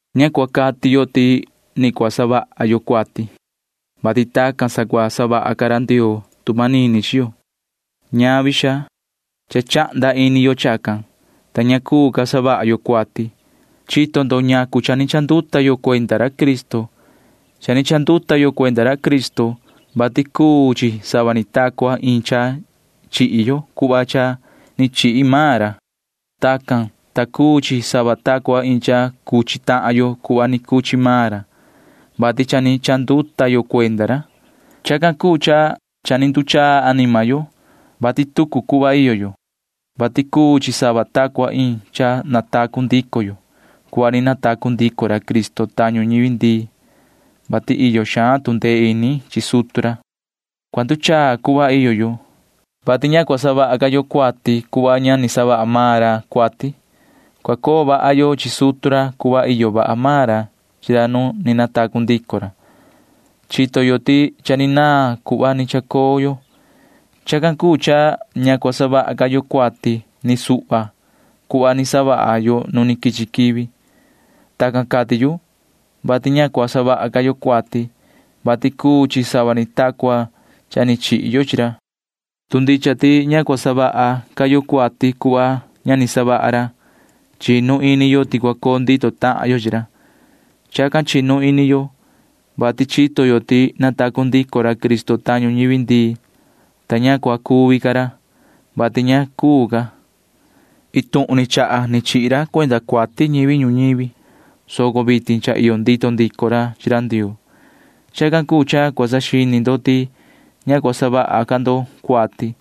Ña cua cati yo ti ni cua savaha yo cuati, vati tacan sa cua savaha ca ra Ndioo tu manini chi yo. Ñavi, xaa. Cha chahnda ini yo chacan, ta ña cuu ca savaha yo cuati. Chito ndo ñacu cha ni chanduta yo cuenda ra Cristo. Cha ni chanduta yo cuenda ra Cristo, vati cuu chi sava ni ta cua iin cha chihi yo cuhva ni chihi maan ra. Tacan cuu, ta cuu chi sava ta cua iin cha cuchi tahan yo cuhva ni cuchi maan ra, vati cha ni chanduta yo cuenda ra. Chacan cuu cha cha ni nduchaa anima yo, vati tucu cuhva iyo yo, vati cuu chi sava ta cua iin cha natacu ndico yo cuhva ni natacu ndico ra Cristo tañu ñivi ndii, vati iyo xaan tu ndee ini chi sutu ra. Cua nduchaa cuhva iyo yo, vati ña cua savaha ca yo cuati cuhva ña ni savaha maan ra cuati. Cua coo vaha yo chi sutu ra cuhva iyo vaha maan ra chi ra nu ni natacu ndico ra. Chito yo ti cha ni naan cuhva ni chacoo yo. Chacan cuu cha ña cua savaha ca yo cuati ni suhva cuhva ni savaha yo nu quichi quivi. Tacan cati yu, vati ña cua savaha ca yo cuati, vati cuu chi sava ni ta cua cha ni chihi yo chi ra. Tu ndicha ti ña cua savaha ca yo cuati cuhva ña ni savaha ra, chinu ini yo ti cua coo ndito tahan yo chi ra. Chacan chinu ini yo, vati chito yo ti natacu ndico ra Cristo tañu ñivi ndii, ta ña cua cuvi ca ra, vati ña cuu ca. Iin tuhun ni chaha ni chihi ra cuenda cuati ñivi ñuñivi, soco vitin cha iyo ndito ndico ra chi ra Ndioo. Chacan cuu cha cua saxini ndo ti ña cua savaha ca ndo cuati,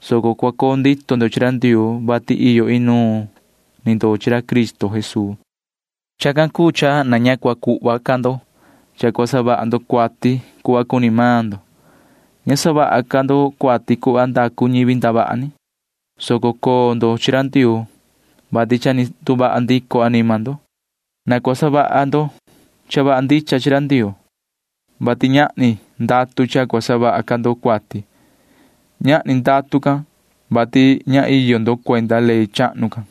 soco cua coo ndito ndo chi ra Ndioo, vati iyo inuun ni ndo chi ra Cristo Jesuu. Chacan cuu cha na ña cua cuhva ca ndo cha cua savaha ndo cuati cuhva cuni maan ndo. Ña savaha ca ndo cuati cuhva ndacu ñivi ndavaha ni, soco coo ndo chi ra Ndioo, vati cha ni nduvaha ndico anima ndo. Na cua savaha ndo cha vaha ndicha chi ra Ndioo, vati ñahni ndatu cha cua savaha ca ndo cuati. Ñahni ndatu can, vati ña iyo ndo cuenda ley chahnu can.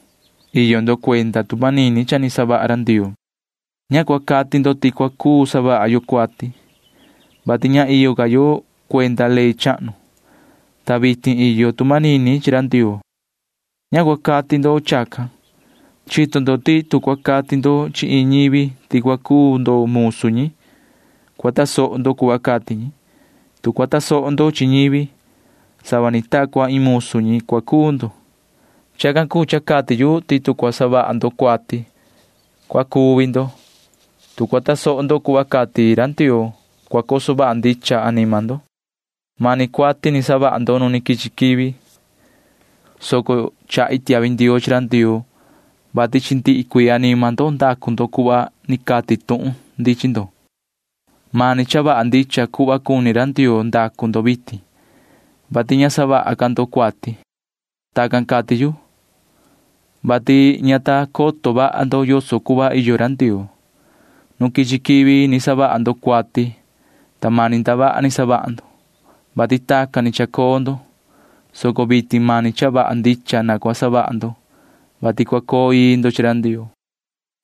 Iyo ndo cuenda tu manini cha ni savaha ra Ndioo. Ña cua cati ndo ti cua cuu savaha yo cuati, vati ña iyo ca yo cuenda ley chahnu, ta vitin iyo tu manini chi ra Ndioo. Ña cua cati ndo chacan. Chito ndo ti tu cua cati ndo chi iin ñivi ti cua cuu ndo musu ñi, cua tasoho ndo cuhva cati ñi. Tu cua tasoho ndo chi ñivi, sava ni ta cua iin musu ñi cua cuu ndo. Chacan cuu cha cati yu ti tu cua savaha ndo cuati, cua cuvi ndo. Tu cua tasoho ndo cuhva cati ra Ndioo, cua coso vaha ndicha anima ndo. Mani cuati ni savaha ndo nu quichi quivi, soco chahi tiahvi ndioo chi ra Ndioo, vati chi ndihi cuii anima ndo ndacu ndo cuhva ni cati tuhun ndi chi ndo. Mani cha vaha ndicha cuhva cuni ra Ndioo ndacu ndo vitin, vati ña savaha ca ndo cuati. Tacan cati yu, vati ña ta coto vaha ndo yoso cuhva iyo ra Ndioo. Nu quichi quivi ni savaha ndo cuati, ta mani ndavaha ni savaha ndo, vati tacan ni chacoo ndo, soco vitin mani cha vaha ndicha na cua savaha ndo, vati cua coo ii ndo chi ra Ndioo.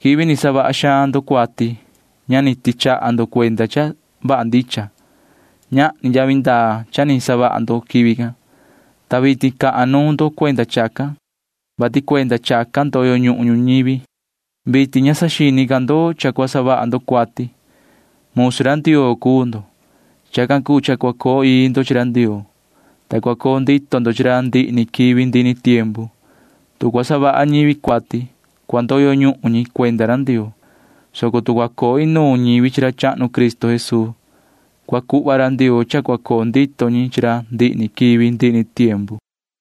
Nu ni savaha xaan ndo cuati ña ni tichaha ni ndo cuenda cha vaha ndicha. Ñahni yavi ndaa cha ni savaha ndo quivi can, ta vitin cahan nuun ndo cuenda chacan, vati cuenda chacan ndoyo ñuhun ñivi. Vitin ña saxini ca ndo cha cua savaha ndo cuati. Musu ra Ndioo cuu ndo. Chacan cuu cha cua coo ii ndo chi ra Ndioo, ta cua coo ndito ndo chi ra ndihi ni quivi ndihi ni tiempu. Tu cua savaha ñivi cuati, cua ndoyo ñuhun ñi cuenda ra Ndioo, soco tu cua coo inuun ñivi chi ra chahnu Cristo Jesuu, cua cuhva ra Ndioo cha cua coo ndito ñi chi ra ndihi ni quivi ndihi ni tiempu.